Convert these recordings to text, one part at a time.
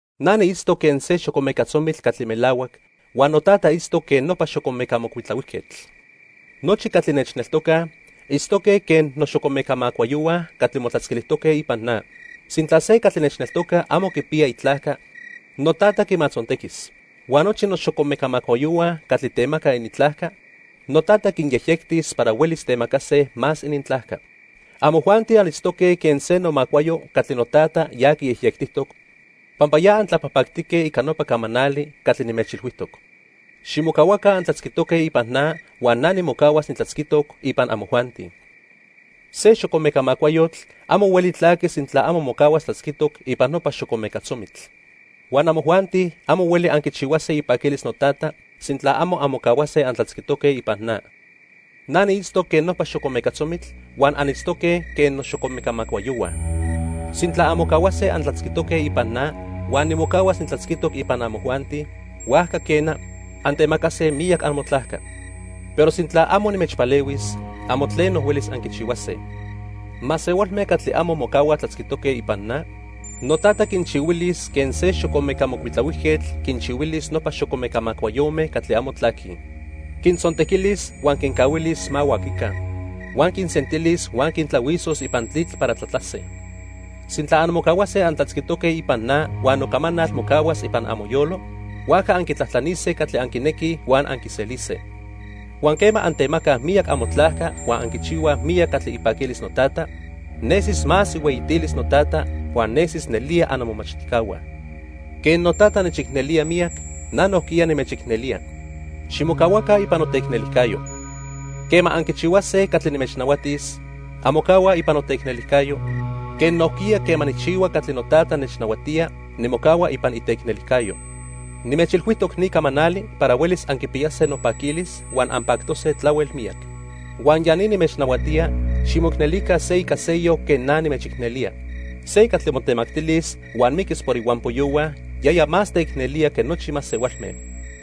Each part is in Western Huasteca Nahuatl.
"Na niitztoc quen se xocomeca tzomitl catli melahuac huan noTata itztoc quen nopa xocomeca mocuitlahuijquetl. Nochi catli nechneltocaj itztoque quen noxocomeca macuayohua catli motlatzquilijtoque ipan na. Sintla se catli nechneltoca amo quipiya itlajca, noTata quimatzontequis. Huan nochi noxocomeca macuayohua catli temacaj inintlajca, noTata quinyejyectis para huelis temacase más inintlajca. Amojuanti anitztoque quen se nomacuayo catli noTata ya quiyejyectijtoc, pampa ya antlapajpactique ica nopa camanali catli nimechmachtijtoc. Ximocahuaca antlatzquitoque ipan na huan na nimocahuas nitlatzquitoc ipan amojuanti. Se xocomeca macuayotl amo hueli tlaqui sintla amo mocahuas tlatzquitoc ipan nopa xocomeca tzomitl. Huan amojuanti amo hueli anquichihuase ipaquilis noTata sintla amo anmocahuase antlatzquitoque ipan na. "Na niitztoc quen nopa xocomeca tzomitl huan anitztoque quen noxocomeca macuayohua. Sintla anmocahuase antlatzquitoque ipan na huan nimocahuas nitlatzquitoc ipan amojuanti, huajca quena, antemacase miyac amotlajca. Pero sintla amo nimechpalehuis, amo tleno huelis anquichihuase. Masehualme catli amo mocahuaj tlatzquitoque ipan na, noTata quinchihuilis quen se xocomeca mocuitlahuijquetl quinchihuilis nopa xocomeca macuayome catli amo tlaquij. Quintzontequilis huan quincahuilis ma huaquica. Huan quinsentilis huan quintlahuisos ipan tlitl para tlatlase. "Sintla anmocahuase antlatzquitoque ipan na huan nocamanal mocahuas ipan amoyolo, huajca anquitlajtlanise catli anquinequij huan anquiselise. Huan quema antemacaj miyac amotlajca huan anquichihuaj miyac catli ipaquilis noTata, nesis más ihueyitilis noTata huan nesis nelía annomomachtijcahua. Quen noTata nechicnelía miyac, na nojquiya nimechicnelía. Ximocahuaca ipan noteicnelijcayo. Quema anquichihuase catli nimechnahuatis, anmocahuaj ipan noteicnelijcayo, quen nojquiya quema nijchihua catli noTata nechnahuatía, nimocahua ipan iteicnelijcayo. "Nimechilhuijtoc ni camanali para huelis anquipiyase nopaquilis huan anpactose tlahuel miyac. Huan ya ni nimechnahuatía, ximoicnelica se ica seyoc quen na nimechicnelía. Se catli motemactilis huan miquis por ihuampoyohua, yaya más teicnelía que nochi masehualme.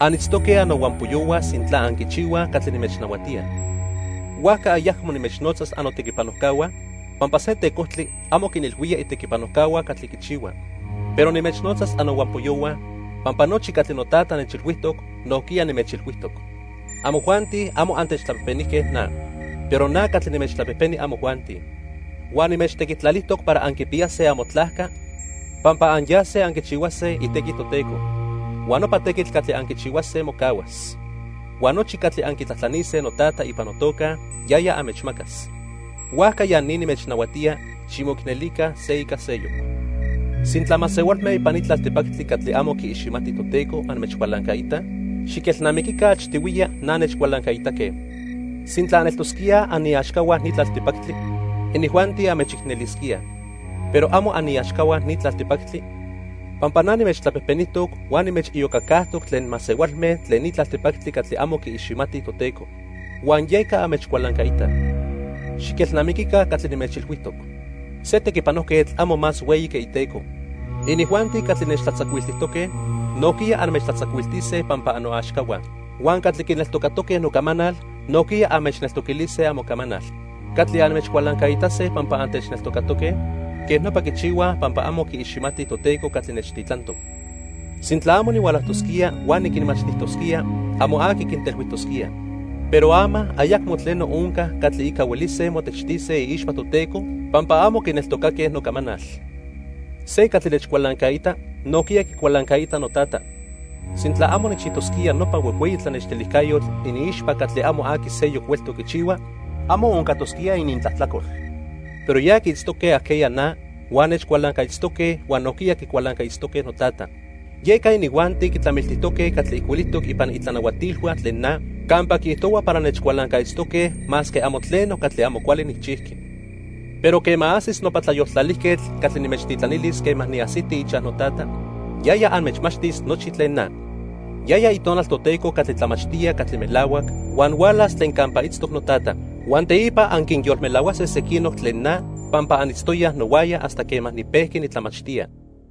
Anitztoque annohuampoyohua sintla anquichihuaj catli nimechnahuatía. Huajca ayacmo nimechnotzas annotequipanojcahua, pampa se tecojtli amo quinilhuía itequipanojcahua catli quichihua. Pero nimechnotzas annohuampoyohua, pampa nochi catli noTata nechilhuijtoc, nojquiya nimechilhuijtoc. Amojuanti amo antechtlapejpenijque na, pero na catli nimechtlapejpeni amojuanti. Huan nimechtequitlalijtoc para anquipiyase amotlajca pampa anyase anquichihuase itequi Toteco. Huan nopa tequitl catli anquichihuase mocahuas. Huan nochi catli anquitlajtlanise noTata ipan notoca, yaya anmechmacas. Huajca ya ni nimechnahuatía: ximoicnelica se ica seyoc. "Sintla masehualme ipan ni tlaltipactli catli amo quiiximatij Toteco anmechcualancaitaj, xiquelnamiquica achtihuiya na nechcualancaitaque. Sintla aneltosquíaj aniaxcahua ni tlaltipactli, inijuanti anmechicnelisquíaj. Pero amo aniaxcahua ni tlaltipactli pampa na nimechtlapejpenijtoc huan nimechiyocacajtoc tlen masehualme tlen ni tlaltipactli catli amo quiiximatij Toteco, huan yeca anmechcualancaitaj. Xiquelnamiquica catli nimechilhuijtoc. Se tequipanojquetl amo más hueyi que iteco. Inijuanti catli nechtlatzacuiltijtoque, nojquiya anmechtlatzacuiltise pampa annoaxcahua. Huan catli quineltocatoque nocamanal nojquiya anmechneltoquilise amocamanal. Catli anmechcualancaitase pampa antechneltocatoque, quej nopa quichihuaj pampa amo quiiximatij Toteco catli nechtitlantoc. "Sintla amo nihualajtosquía huan niquinmachtijtosquía, amo aqui quintelhuijtosquía. Pero ama ayacmo tleno onca catli ica huelise motechtise iixpa Toteco pampa amo quineltocaque nocamanal. Se catli nechcualancaita, nojquiya quicualancaita noTata. Sintla amo nijchijtosquía nopa huejhueyi tlanextilijcayotl iniixpa catli amo aqui seyoc hueltoc quichihua, amo oncatosquía inintlajtlacol. Pero ya quiitztoque ajqueya na huan nechcualancaitztoque huan nojquiya quicualancaitztoque noTata. Yeca inijuanti quitlamiltijtoque catli ijcuilijtoc ipan inintlanahuatilhua tlen na campa quiijtohua para nechcualancaitztoque masque amo tleno catli amo cuali nijchijqui. "Pero quema ajsis nopa Tlayoltlalijquetl catli nimechtitlanilis quema niajsiti ichaj noTata, yaya anmechmachtis nochi tlen na. Yaya Itonal Toteco catli tlamachtía catli melahuac huan hualas tlen campa itztoc noTata. Huan teipa anquinyolmelahuase sequinoc tlen na pampa anitztoyaj nohuaya hasta quema nipejqui nitlamachtía.